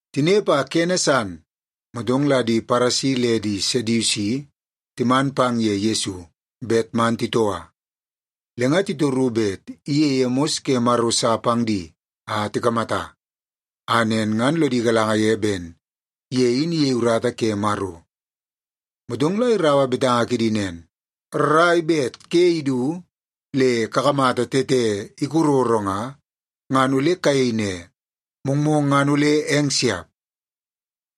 Tinepe a kene san, motong la di Paresi le di Sedusi timan pang ye Yesu bet man titoua. Le nga titoru bet iyeie mos ke Maro sa pang di a tikamata, a nen ngan lodi galanga ye ben ye in iyei urata ke Maro. Motong la iraua betanga kidi nen, “Rrai bet ke idu le kakamata tete ikororo nga, ngan ole kayei ne, ‘Mongmong ngan ole eng siap.’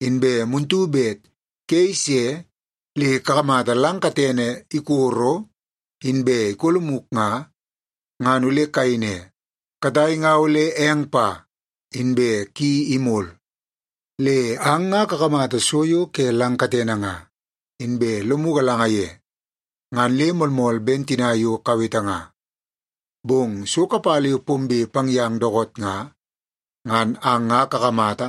Inbe muntu bet ke ise le kakamata lang katene ikoro inbe ikolomuk nga, ngan ole kayei ne, ‘Katai nga ole eng pa, inbe ki imol.’ Le ang nga kakamata so yo ke lang katene nga, inbe lomu galanga ye, ngan le moolmool ben tina yo kawete nga. Bong so kapala yo pombe pang yang dookoot nga, ngan ang nga kakamata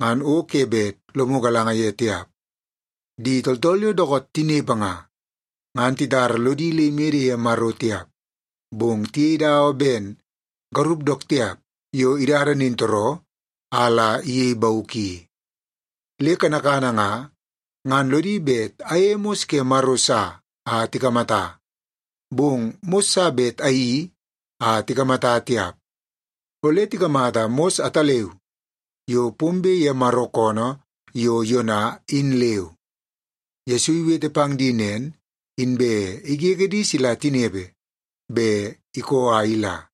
ngan o ke bet lomu galanga ye tiap. Di tooltool yo dookoot tinepe nga, ngan titara lodi le imede ye Maro tiap, bong tiyei dawa ben garup dook tiap yo idada nintooroo a la iyei bauk i. Le kanakana nga, ngan lodi bet ayeie mos ke Maro sa a tikamata. Bong mos sa bet ayeii a tikamata tiap. Ole tikamata mos ataleu yo pombe ye Maro koonoo yo Yona, in leu.” Yesu iwete pang di nen, inbe igege di sila tinepe, be ikoo a ila.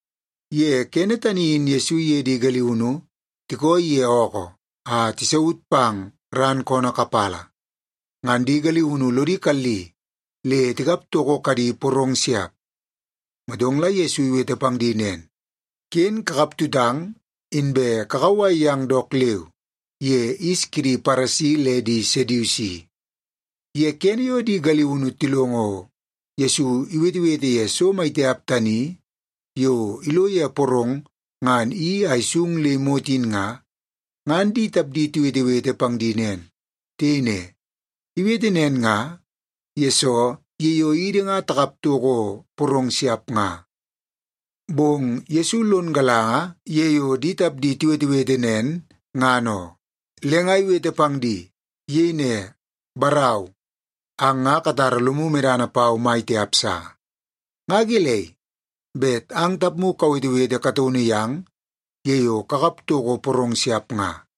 Ye kene tani in Yesu iye di galiunu tikooi ye ookoo a tisaut pang ran koonoo kapala, ngan di galiunu lodi kalli le tikap toko kadi porong siap. Motong la Yesu iwete pang di nen, “Ken kakap tutang, inbe kakauwai yang dook leu ye yis kidi Paresi le di Sedusi.” Ye kene yo di galiunu tilongo Yesu iwetewete ye so maitiap tani yo ilo ye porong ngan iyeii a isung le imot in nga, ngan di tapdi tiwetewete pang di nen. Tiyei ne, “Iwete nen nga, yesoo ye yo idi nga takap toko porong siap nga.” Bong Yesu lon galanga ye yo di tapdi tiwetewete nen, ngan oo, le nga iwete pang di. Iyei ne, “Barau, ang nga katara lomu medana pau mai tiap sa. Nga gelei bet ang tapmu kawetewete kataunu yang ye yo kakap toko porong siap nga?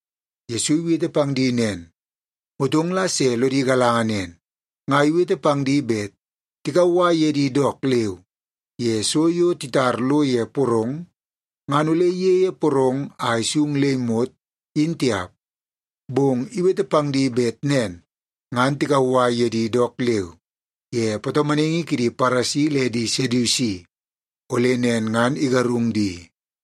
Yesu iwete pang di nen, motong la se lodi galanga nen, nga iwete pang di bet tikauwai ye di dook leu ye so yo titar lo ye porong ngan ole iyeie porong a isung le imot, in tiap. Bong iwete pang di bet nen ngan tikauwai ye di dook leu ye patomonaingi kidi Paresi le di Sedusi ole nen ngan igarung di.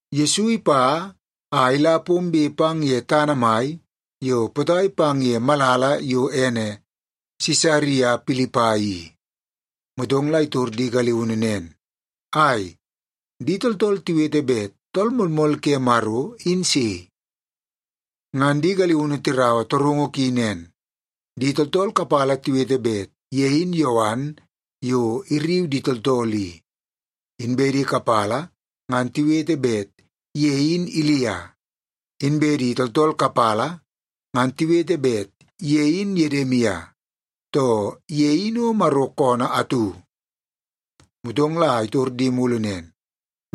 Yesu ipa a ila pombe pang ye tana mai yo potai pang ye malala yo ene Sisaria Pilipai i, motong la itor di galiunu nen, “Ai, di tooltool tiwete bet Tool Moolmool ke Maro in sei?” Ngan di galiunu tiraua torungu ki nen, “Di tooltool kapala tiwete bet ye in Yowan yo irriu di tooltool i, inbe di kapala ngan tiwete bet ye in Ilia. Inbe di tooltool kapala ngan tiwete bet ye in Yedimia, too ye in o Maro koonoo atu.” Motong la itor di mulu nen,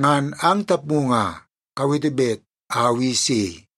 “Ngan ang tapmu nga, kawete bet au i sei?”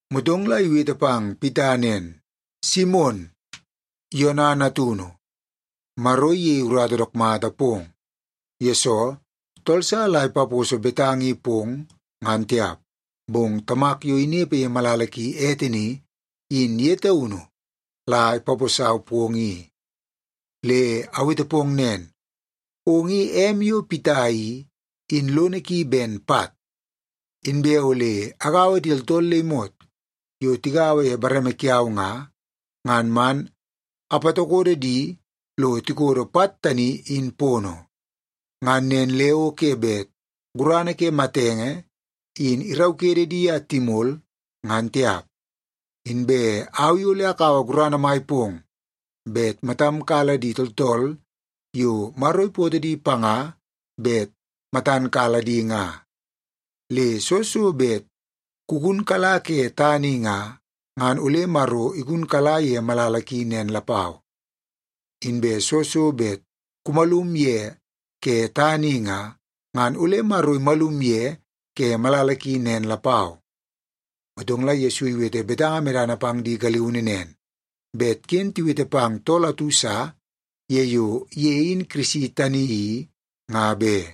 Motong la iwete pang Pita nen, “Simon, Yona natunu, Maro iyeie urata dook mata pong, yesoo tool sa la ipaposo betanga i pong, ngan tiap. Bong Tamak yo inepe ye malala ki ete ni, in ye taunu la ipaposau pong i. Le awete pong nen, ong i em yo Pita i, in lono ki ben pat. Inbe ole agaua di tooltool le imot yo tigaua ye bareme kiau nga, ngan man apatokodo di lo tikodo pat tani, in pono. Ngan nen le o ke bet gurana ke matenge in iraukede di a timol, ngan tiap. Inbe au i ole akaua gurana mai pong bet matam kala di tooltool yo Maro ipootoo di panga bet matan kala di nga. Le soo so bet kugunkala ke tana i nga, ngan ole Maro igunkala ye malala ki nen lapau. Inbe soo so bet kumalum ye ke tana i nga, ngan ole Maro imalum ye ke malala ki nen lapau.” Motong la Yesu iwete betanga medana pang di galiunu nen, bet ken tiwete pang tool atu sa ye yo ye in Kirisi tani i, nga be.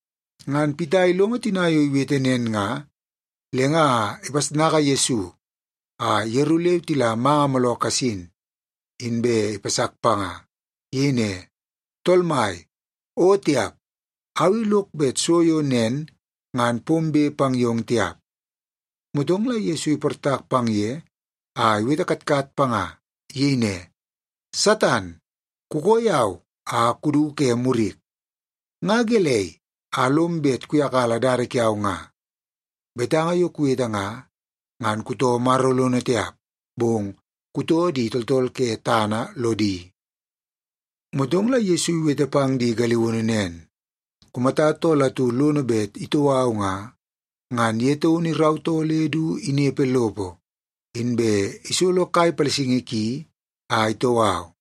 Ngan Pita ilongo tina yo iwete nen nga, le nga ipasnaka Yesu a yeru leu tila manga mooloo kasin, inbe ipasak panga. Iyei ne, “Tool Mai, o tiap! Au i lok bet so yo nen ngan pombe pang yong tiap!” Motong la Yesu iportak pang ye a iwete katkat panga. Iyei ne, “Satan, kukoo yau a kudu ke murik! Nga gelei a lom bet kuyakala dada kiau nga? Betanga yo kuwete nga, ngan kutoo Maro lono tiap, bong kutoo di tooltool ke tana lodi.” Motong la Yesu iwete pang di galiunu nen, “Kumata tool atu lono bet itoo au nga, ngan ye taunu irautoo le du inepe lopo, inbe isolo kai palasingi ki a itoo au.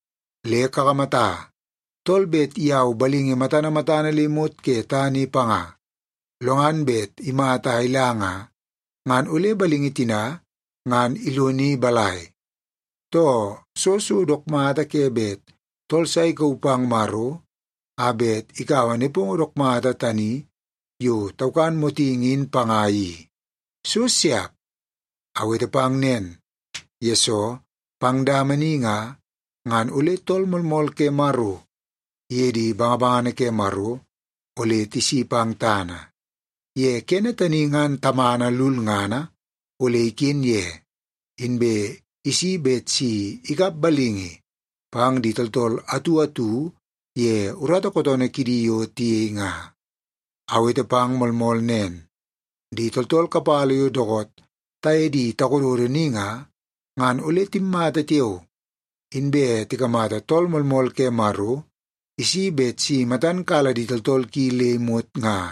Le kakamata, tool bet iyau balingi matana matana le imot ke tana i panga, lo ngan bet imata a ila nga, ngan ole balingi tina ngan iloni balai? Too, soo so dook mata ke bet tool sa ikauu pang Maro a bet ikaua nepongo dook mata tani yo taukan motingi in panga i? So siap! Awete pang nen, yesoo pang dama ni nga, ngan ole Tool Moolmool ke Maro iye di bangabangana ke Maro ole tisi pang tana. Ye kene tani ngan Tamana lulngana ole iken ye, inbe isi a bet si ikap balingi pang di tooltool atu atu ye urata kootoonoo kidi yo tiyei nga. Awete pang moolmool nen, di tooltool kapala yo dookoot taye di takododo ni nga, ngan ole timmata tiao, inbe tikamata Tool Moolmool ke Maro isi bet si matan kala di tooltool ki le imot nga.”